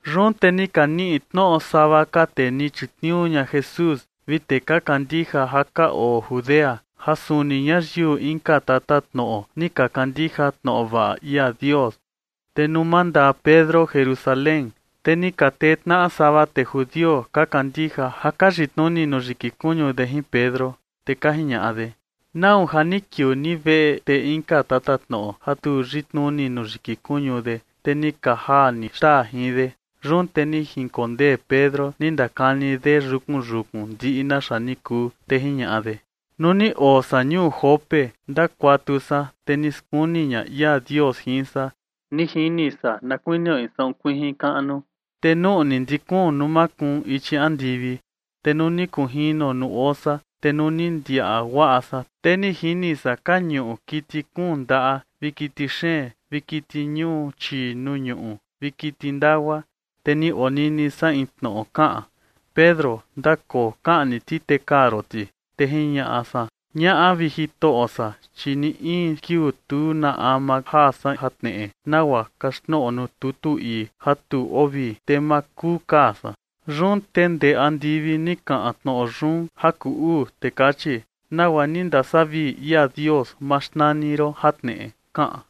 Yun te ni ka niꞌi tnoꞌo sava ka tee ni chitniuu ña Jesús vi tee ka kandija ja ka oo Judea, ja suni ñayiu inka tatatnoꞌo ni ka kandija tnoꞌo vaꞌa ia Dios. Te nuu mandaa Pedro Jerusalén, te ni ka tee tnaꞌa sava tee judio ka kandija ja ka yitnuni nuu yiki kuñu de jin Pedro. Te ka jiñaꞌa de: ―¿Nau ja ni kiuu ni veꞌe tee inka tatatnoꞌo ja tu yitnuni nuu yiki kuñu de, te ni ka jaa ni xtaa jin de? Yun te ni jinkondee Pedro ni ndakani de yukun yukun ndiꞌi naxa ni kuu, te jiñaꞌa de: ―Nuu ni oo san ñuu Jope, ndakuatu san, te ni skuni ña ia Dios jin san. Ni jini san na kuinio in saꞌun kuijin kaꞌnu, te nuꞌni ndi kuun nuu makuun ichi andivi, te ni kunjino nuu oo san. Te nuu ni ndiaꞌa guaꞌa san, te ni jini san ka ñuꞌu kiti kuun ndaꞌa vi kiti xeen vi kiti ñuu chii nuu ñuꞌu vi kiti ndagua. Te ni onini san in tnoꞌo kaꞌan: “Pedro, ndakoo, kaꞌni ti, te kaa ron ti”. Te jiñaꞌa san: “Ñaꞌa, vi Jitoꞌo san, chi ni in kiuu tu na ama jaa san jatneꞌe nagua kaxtnoꞌo nuu tutu ii ja tu oo vii, te ma kuu kaa san”. Yun te ndee andivi ni kaꞌan tnoꞌo yun ja kuu uu, te kachi: “Nagua ni ndasavii ia Dios, ma xnani ron jatneꞌe”, kaꞌan.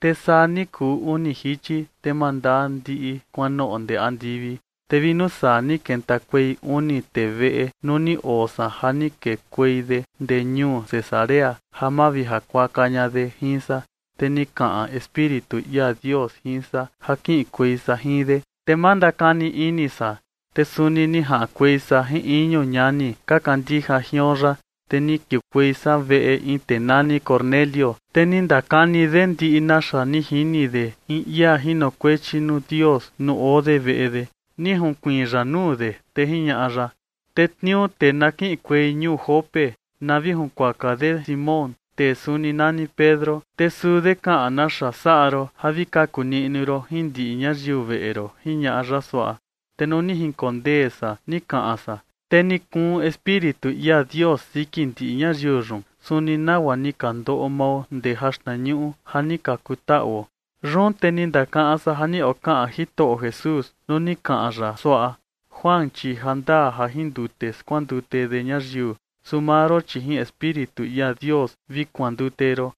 Te saa ni kuu uni jichi, te mandaa ndiꞌi kuanoꞌo ndee andivi. Te vi nuu saa ni kentakuei uni tee veꞌe nuu ni oo san ja ni kekuei de ndee ñuu Cesarea ja mavijakuaka ña de jin san. Te ni kaꞌan Espíritu ia Dios jin san ja kiꞌinkuei san jin de, te ma ndakani ini san. Te suni ni jaꞌankuei san jin iñu ñani ka kandija jion yaꞌa, te ni kiukuei san veꞌe in tee nani Cornelio. Te ni ndakani de ndiꞌi naxa ni jini de in ia jinokuechi nuu Dios nuu oo de veꞌe de. Ni junkuiin ya nuu de, te jiñaꞌa ya: “Tetniuu tee na kiꞌinkuei ñuu Jope na vi junkuaka de Simón, tee suni nani Pedro. Te suu de kaꞌan naxa saꞌa ron ja vi kaku niꞌnu ron jin ndiꞌi ñayiu veꞌe ron” jiñaꞌa ya suaꞌa. Te nuu ni jinkondee san ni kaꞌan san, te ni kuun Espíritu ia Dios siki ndiꞌi ñayiu yun, suni nagua ni ka ndoꞌo mao ndee jaxtnañuꞌu ja ni ka kutaꞌuo. Yun te ni ndakaꞌan san ja ni okaꞌan Jitoꞌo Jesús nuu ni kaꞌan ya suaꞌa: “Juan, chi jandaa ja jin ndute skuandute de ñayiu, su maa ron, chi jin Espíritu ia Dios vi kuandute ron”.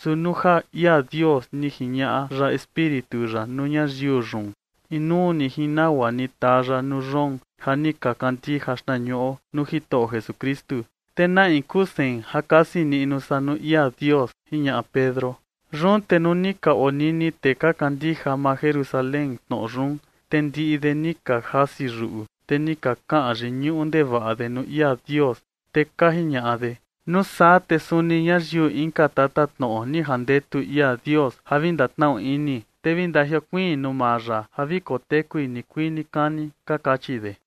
Su nuu ja ia Dios ni jiñaꞌa ya Espíritu ya nuu ñayiu yun, inuu ni jin nagua ni taa ya nuu yoon ja ni ka kandija xtnañuꞌo nuu Jitoꞌo Jesukristu, te ¿na in kuu sein ja kasi niꞌnu san nuu ia Dios? ―jiñaꞌa Pedro. Yun te nuu ni ka onini tee ka kandija maa Jerusalén tnoꞌo yun, te ndiꞌi de ni ka jasi yuꞌu, te ni ka kaꞌan yiñuꞌu ndevaꞌa de nuu ia Dios, te ka jiñaꞌa de: ―Nuu saa te suni ñayiu inka tatatnoꞌo ni jandetu ia Dios ja vi ndatnaꞌu ini, te vi ndajiokuiin nuu maa ya ja vi kotekui nikuii nikani ―ka kachi de.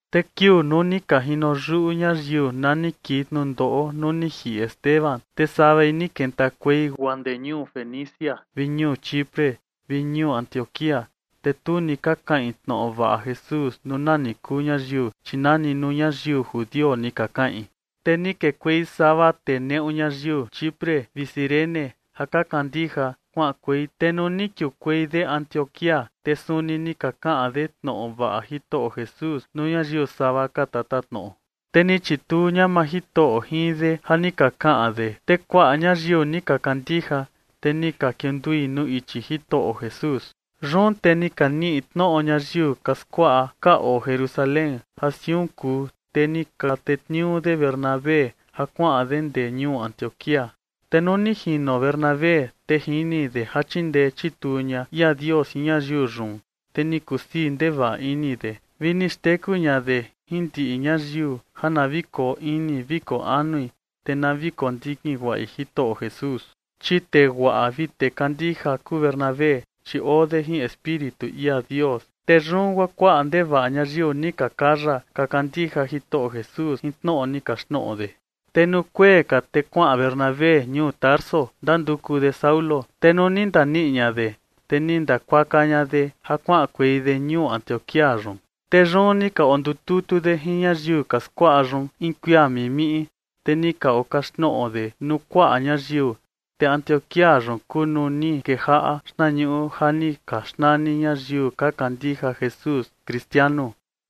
Te kiuu nuu ni ka jino yuꞌu ñayiu na ni kii tnundoꞌo nuu ni jiꞌi Esteban, te savai ni kentakuei guaa ndee ñuu Fenicia vi ñuu Chipre vi ñuu Antioquía. Te tu ni ka kaꞌin tnoꞌo vaꞌa Jesús nuu nani kuu ñayiu, chi nani nuu ñayiu judio ni ka kaꞌin. Te ni kekuei sava tee neꞌu ñayiu Chipre vi Cirene ja ka kandija kuaꞌankuei. Te nuu ni kiukuei de Antioquía, te suni ni ka kaꞌan de tnoꞌo vaꞌa Jitoꞌo Jesús nuu ñayiu sava ka tatatnoꞌo. Te ni chituu ña maa Jitoꞌo jin de ja ni ka kaꞌan de, te kuaꞌa ñayiu ni ka kandija, te ni ka kiundui nuu ichi Jitoꞌo Jesús. Yun te ni ka niꞌi tnoꞌo ñayiu ka skuaꞌa ka oo Jerusalén ja siun kuu, te ni ka tetniuu de Bernabé ja kuaꞌan de ndee ñuu Antioquía. Te nuu ni jino Bernabé, te jini de ja chindee chituu ña ia Dios jin ñayiu yun, te ni kusii ndevaꞌa ini de, vi ni xteku ña de jin ndiꞌi ñayiu ja na vi koo ini vi koo anui, te na vi kondikin guaꞌi Jitoꞌo Jesús. Chi tee guaꞌa vi tee kandija kuu Bernabé, chi oo de jin Espíritu ia Dios. Te yun guaa kuaꞌa ndevaꞌa ñayiu ni ka kaya ka kandija Jitoꞌo Jesús jin tnoꞌo ni kaxtnoꞌo de. Te nuu kuee ka, te kuaꞌan Bernabé ñuu Tarso, ndanduku de Saulo. Te nuu ni ndaniꞌi ña de, te ni ndakuaka ña de ja kuaꞌankuei de ñuu Antioquía yun. Te yun ni ka ondututu de jin ñayiu ka skuaꞌa yun in kuia mimiꞌi. Te ni ka okaxtnoꞌo de nuu kuaꞌa ñayiu. Te Antioquía yun kuu nuu ni kejaꞌa xtnañuꞌu ja ni ka xnani ñayiu ka kandija Jesús “Kristianu”.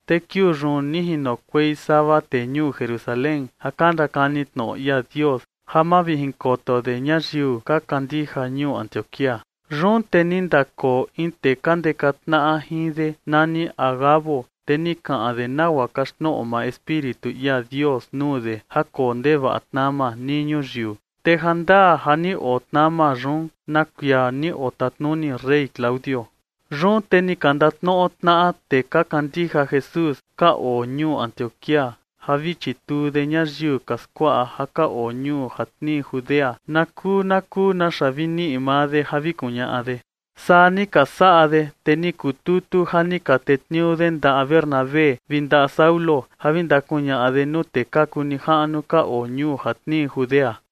Te kiuu yun ni jinokuei sava tee ñuu Jerusalén ja ka ndakani tnoꞌo ia Dios ja mavijinkoto de ñayiu ka kandija ñuu Antioquía. Yun te ni ndakoo in tee ka ndeka tnaꞌa jin de nani Agabo, te ni kaꞌan de nagua kaxtnoꞌo maa Espíritu ia Dios nuu de ja koo ndevaꞌa tnama nii ñuyiu, te jandaa ja ni oo tnama yun na kuia ni otatnuni rey Claudio. Yun te ni ka ndatnoꞌo tnaꞌa tee ka kandija Jesús ka oo ñuu Antioquía ja vi chituu de ñayiu ka skuaꞌa ja ka oo ñuu ja tnii Judea na kuu na kuu naxa vi niꞌi maa de ja vi kuñaꞌa de. Saa ni ka saꞌa de. Te ni kututu ja ni ka tetniuu de ndaꞌa Bernabé vi ndaꞌa Saulo ja vi ndakuñaꞌa de nuu tee ka kuu nijaꞌnu ka oo ñuu ja tnii Judea.